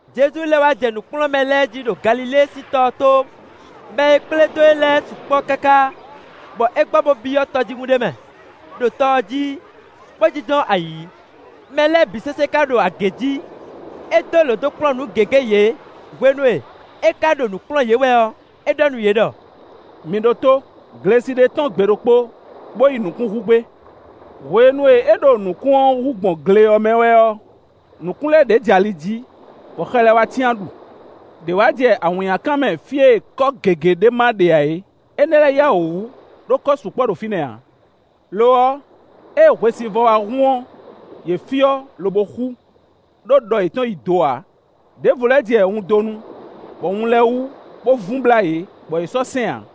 Jezu lɛ́ wá jɛ nǔ kplɔ́n mɛ lɛ́ɛ jí ɖo Galilée sín tɔ ɔ́ tó. Mɛ e kplé dó e lɛ́ɛ sukpɔ́ káká, bɔ é gbɔ bó byɔ́ tɔjíhún ɖé mɛ, ɖo tɔ ɔ́ jí, bó jínjɔ́n ayǐ; mɛ lɛ́ɛ bǐ sésé ká ɖo agě jǐ. É dó lǒ dó kplɔ́n nǔ gěgé yě. Hwenu e é ka ɖo nǔ kplɔ́n yě wɛ ɔ́, é ɖɔ nú yě ɖɔ: “Mi ɖótó! Glesi ɖé tɔ́n gbe ɖokpó, bó yi nǔkún hú gbé. Hwenu e é ɖo nǔkún ɔ́ hú gbɔn gle ɔ́ mɛ wɛ ɔ́, nǔkún lɛ́ɛ ɖě jɛ ali jí, bɔ xɛ lɛ́ɛ wá cyán ɖu. Đě wá jɛ awǐnnyakan mɛ fí e kɔ́ gěgé ɖé ma ɖe ǎ é; énɛ́ lɛ́ɛ yá wǔ wú, ɖó kɔ́ sukpɔ́ ɖo fínɛ́ ǎ. Lo ɔ́, ée hwesivɔ́ wá hun ɔ́, yě fyɔ́, lobo xú; ɖó ɖɔ yětɔn yi do ǎ. Đěvo lɛ́ jɛ wundonu, bɔ wun lɛ́ɛ wú, bó vun blá yě, bɔ yě sɔ́ sɛ́n ǎ.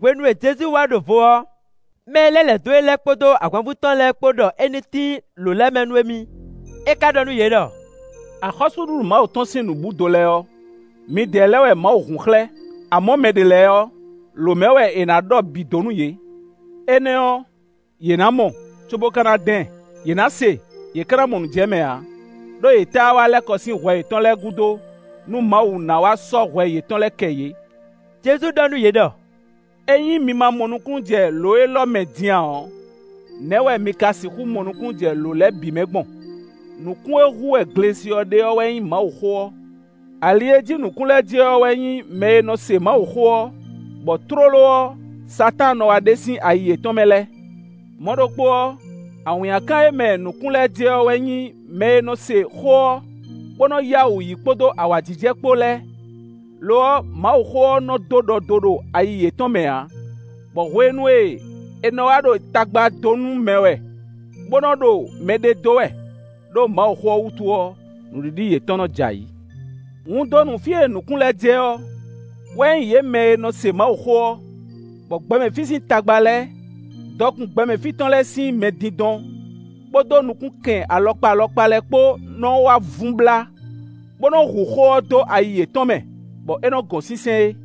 Hwenu e Jezu wá ɖo vo ɔ́, mɛ e lɛ́ lɛ̌ dó e lɛ́ɛ kpódó ahwanvú tɔn lɛ́ɛ kpó ɖɔ é ní tín lǒ lɛ́ɛ mɛ nú émí. É ka ɖɔ nú yě ɖɔ: “Axɔ́súɖuɖu Mawu tɔn sín nǔbúdo lɛ́ɛ ɔ́, midɛɛ lɛ́ɛ wɛ Mawu hun xlɛ́, amɔ̌, mɛ ɖě lɛ́ɛ ɔ́, lǒ mɛ wɛ è nǎ ɖɔ bǐ dó nú yě. Énɛ́ ɔ́, ‘Yě ná mɔ, cóbó ka ná dán ɛ; yě ná se, yě ka ná mɔ nǔ jɛ mɛ ǎ. Đó yě táá wá lɛ́ kɔ sín hwɛ yětɔn lɛ́ɛ gúdo, nú Mawu ná wá sɔ́ hwɛ yětɔn lɛ́ɛ kɛ yě.’” Jezu ɖɔ nú yě ɖɔ: “Ényí mi ma mɔ nukúnnú jɛ lǒ élɔ́ mɛ din ǎ ɔ́, nɛ̌ wɛ mi ka sixú mɔ nukúnnú jɛ lǒ lɛ́ɛ bǐ mɛ gbɔn? Nǔkún e hú wɛ glesi ɔ́ ɖe ɔ́ wɛ nyí Mawuxó ɔ́. Ali e jí nǔkún lɛ́ɛ jɛ ɔ́ wɛ nyí mɛ e nɔ se Mawuxó ɔ́, bɔ tlóló ɔ́, Satáan nɔ wá ɖe sín ayi yětɔn mɛ lɛ́ɛ. Mɔ̌ ɖokpó ɔ́, awǐnnyakan e mɛ nǔkún lɛ́ɛ jɛ ɔ́ wɛ nyí mɛ e nɔ se xó ɔ́, bó nɔ yá wǔ yí kpódó awǎjijɛ kpó lɛ́ɛ, lo ɔ́, Mawuxó ɔ́ nɔ́ dó ɖɔ do ɖo ayi yětɔn mɛ ǎ, bɔ hwenu e è nɔ wá ɖo tagba dó nú mɛ wɛ, bó nɔ́ ɖo mɛ ɖe dó wɛ, ɖó Mawuxó ɔ́ wútu ɔ́, nǔɖiɖi yětɔn nɔ́ jɛ ayǐ. Wundonu fí e nǔkún lɛ́ɛ jɛ ɔ́, wɛ nyí yě mɛ e nɔ se Mawuxó ɔ́, bɔ gbɛmɛ fí sín tagba lɛ́ɛ, dɔkun gbɛmɛ fí tɔn lɛ́ɛ sín mɛdindɔn kpódó nukúnkɛn alɔkpa alɔkpa lɛ́ɛ kpó nɔ́ wá vun blá, bó nɔ́ hu xó ɔ́ ɖo ayi yětɔn mɛ, bɔ é nɔ gɔn sínsɛ́n é.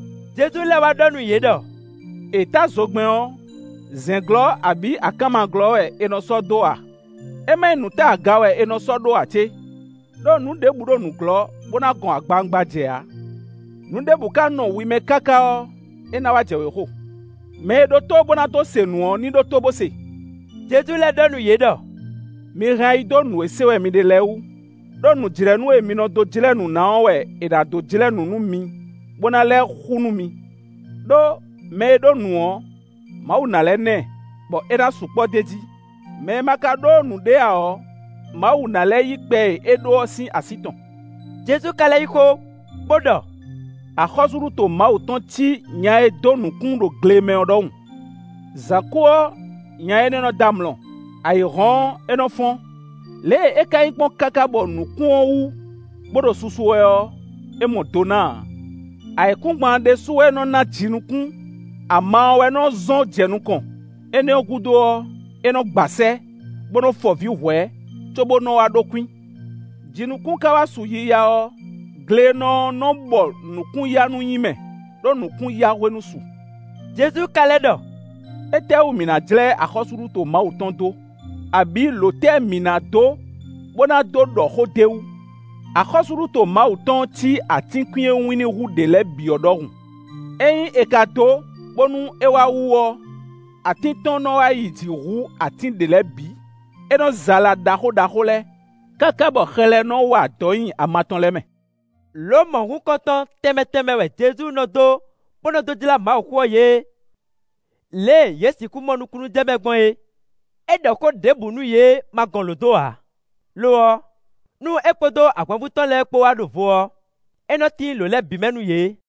Jezu lɛ́ wá ɖɔ nú yě ɖɔ: “È tá zogbɛ́n ɔ́, zɛ̌n glɔ́ abǐ akánma glɔ́ wɛ è nɔ sɔ́ dó a? É má nyí nǔ ta aga wɛ è nɔ sɔ́ ɖó ǎ cé? Đó nǔ ɖěbǔ ɖo nǔglɔ́, bó ná gɔn agbawungba jɛ ǎ. Nǔ ɖěbǔ ka nɔ wi mɛ káká ɔ́, é ná wá jɛ wěxo. Mɛ e ɖó tó bó ná dó se nǔ ɔ́ ní ɖótó bó se.” Jezu lɛ́ ɖɔ nú yě ɖɔ: “Mi hɛn ayi dó nǔ e se wɛ mi ɖe lɛ́ɛ wú, ɖó nǔjlɛ́nú e mi nɔ dó jlɛ́ nǔ ná ɔ́ wɛ è nǎ dó jlɛ́ nǔ nú mi, bó ná lɛ́ xú nú mi. Đó, mɛ e ɖó nǔ ɔ́, Mawu ná lɛ́ ná ɛ, bɔ é ná sukpɔ́ d'é jí; mɛ e ma ka ɖó nǔɖé ǎ ɔ́, Mawu ná lɛ́ yí kpɛ e é ɖó ɔ́ sín así tɔn.” Jezu ka lɛ́ yí xó, bó ɖɔ: “Axɔ́súɖuto Mawu tɔn cí nya e dó nǔkún ɖo gle mɛ ɔ́ ɖɔhun. Zǎn kú ɔ́, nya énɛ́ ɔ́ nɔ́ dɔ́ amlɔ; ayǐ hɔ́n ɔ́, é nɔ́ fɔ́n; lě e é ka nyí gbɔn káká bɔ nǔkún ɔ́ wú bó ɖo susu wɛ ɔ́, é mɔ do ná ǎ. Ayǐkúngban ɔ́ ɖésú wɛ nɔ́ ná jinukún; ama ɔ́ wɛ nɔ́ zɔ́n jɛ nukɔn; énɛ́ gúdo ɔ́, é nɔ́ gba sɛ́, bó nɔ́ fɔ vǐ hwɛ̌ cóbó nɔ́ wá ɖó kwín. Jinukún ka wá su yiya ɔ́, glenɔ ɔ́ nɔ́ bɔ nǔkún-yanú nyi mɛ, ɖó nǔkún-yahwenu su.” Jezu ka lɛ́ ɖɔ: “Étɛ́wú mǐ ná jlɛ́ axɔ́súɖuto Mawu tɔn dó? Abǐ lǒ tɛ́ wɛ mǐ ná dó bó ná dó ɖɔ xó d'é wú? Axɔ́súɖuto Mawu tɔn ɔ́ cí atínkwín e wínní hú ɖě lɛ́ɛ bǐ ɔ́ ɖɔhun. Ényí è ka dó, bónú é wá wú ɔ́, atín tɔn nɔ́ wá yi jǐ hú atín ɖě lɛ́ɛ bǐ. É nɔ́ zɛ ala ɖaxó ɖaxó lɛ́ɛ, káká bɔ xɛ lɛ́ɛ nɔ́ wa adɔ̌ nyi ama tɔn lɛ́ɛ mɛ.” Lǒ mɔ̌hunkɔtɔn tɛnmɛ tɛnmɛ wɛ Jezu nɔ dó bó nɔ́ dó jlá Mawuxó ɔ́ yě, lě e yě sixú mɔ nukúnnú jɛ mɛ gbɔn é. É ɖɔ xó ɖěbǔ nú yě ma gɔn lǒ dó ǎ; lo ɔ́, nú é kpódó ahwanvú tɔn lɛ́ɛ kpó wá ɖo vo ɔ́, é nɔ́ tín lǒ lɛ́ɛ bǐ mɛ nú yě.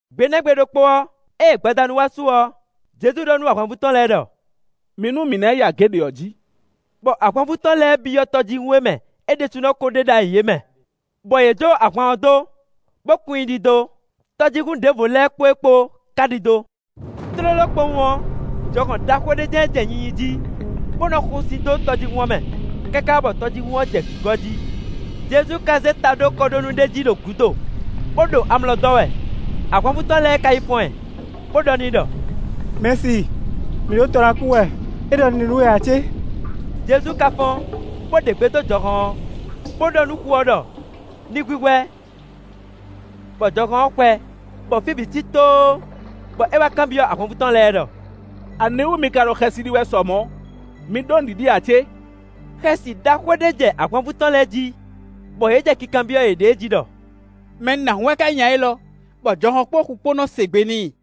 Gbe nɛ́ gbe ɖokpó ɔ́, ée gbadanu wá su ɔ́, Jezu ɖɔ nú ahwanvú tɔn lɛ́ɛ ɖɔ: “Mi nú mǐ ná yi agě ɖě ɔ́ jǐ.” Bɔ ahwanvú tɔn lɛ́ɛ byɔ́ tɔjíhún e mɛ é ɖésúnɔ ko ɖe ɖ'ayǐ é mɛ, bɔ yě jó ahwan ɔ́ dó, bó kun i ɖidó. Tɔjíhún ɖěvo lɛ́ɛ kpó e kpó ka ɖidó. Tlóló kpowun ɔ́, jɔhɔn ɖaxó ɖé jɛ́n jɛ nyinyi jí, bó nɔ́ xo sin dó tɔjíhún ɔ́ mɛ, káká bɔ tɔjíhún ɔ́ jɛ gǐgɔ́ jí. Jezu ka zé ta ɖó kɔɖónú ɖé jí ɖo gǔdo, bó ɖo amlɔ dɔ́ wɛ. Ahwanvú tɔn lɛ́ɛ ká yi fɔ́n ɛ, bó ɖɔ n'i ɖɔ: “Mɛ̌si, mǐ ɖo tɔ ná kú wɛ, é ɖɔ nǔɖé nú we ǎ cé?” Jezu ka fɔ́n, bó ɖe gbe dó jɔhɔn ɔ́, bó ɖɔ nú xu ɔ́ ɖɔ ní hwíhwɛ́, bɔ jɔhɔn ɔ́ xwɛ, bɔ fí bǐ cí tóó. Bɔ é wá kanbyɔ́ ahwanvú tɔn lɛ́ɛ ɖɔ: “Aniwú mi ka ɖo xɛsi ɖi wɛ sɔ mɔ̌? Mi ɖó nǔɖiɖi ǎ cé?” Xɛsi ɖaxó ɖé jɛ ahwanvú tɔn lɛ́ɛ jí, bɔ yě jɛ kinkanbyɔ́ yěɖée jí ɖɔ: “Mɛ nǎhún wɛ ká nyí nya élɔ́, bɔ jɔhɔn kpódó xu kpó nɔ́ se gbe n'i?”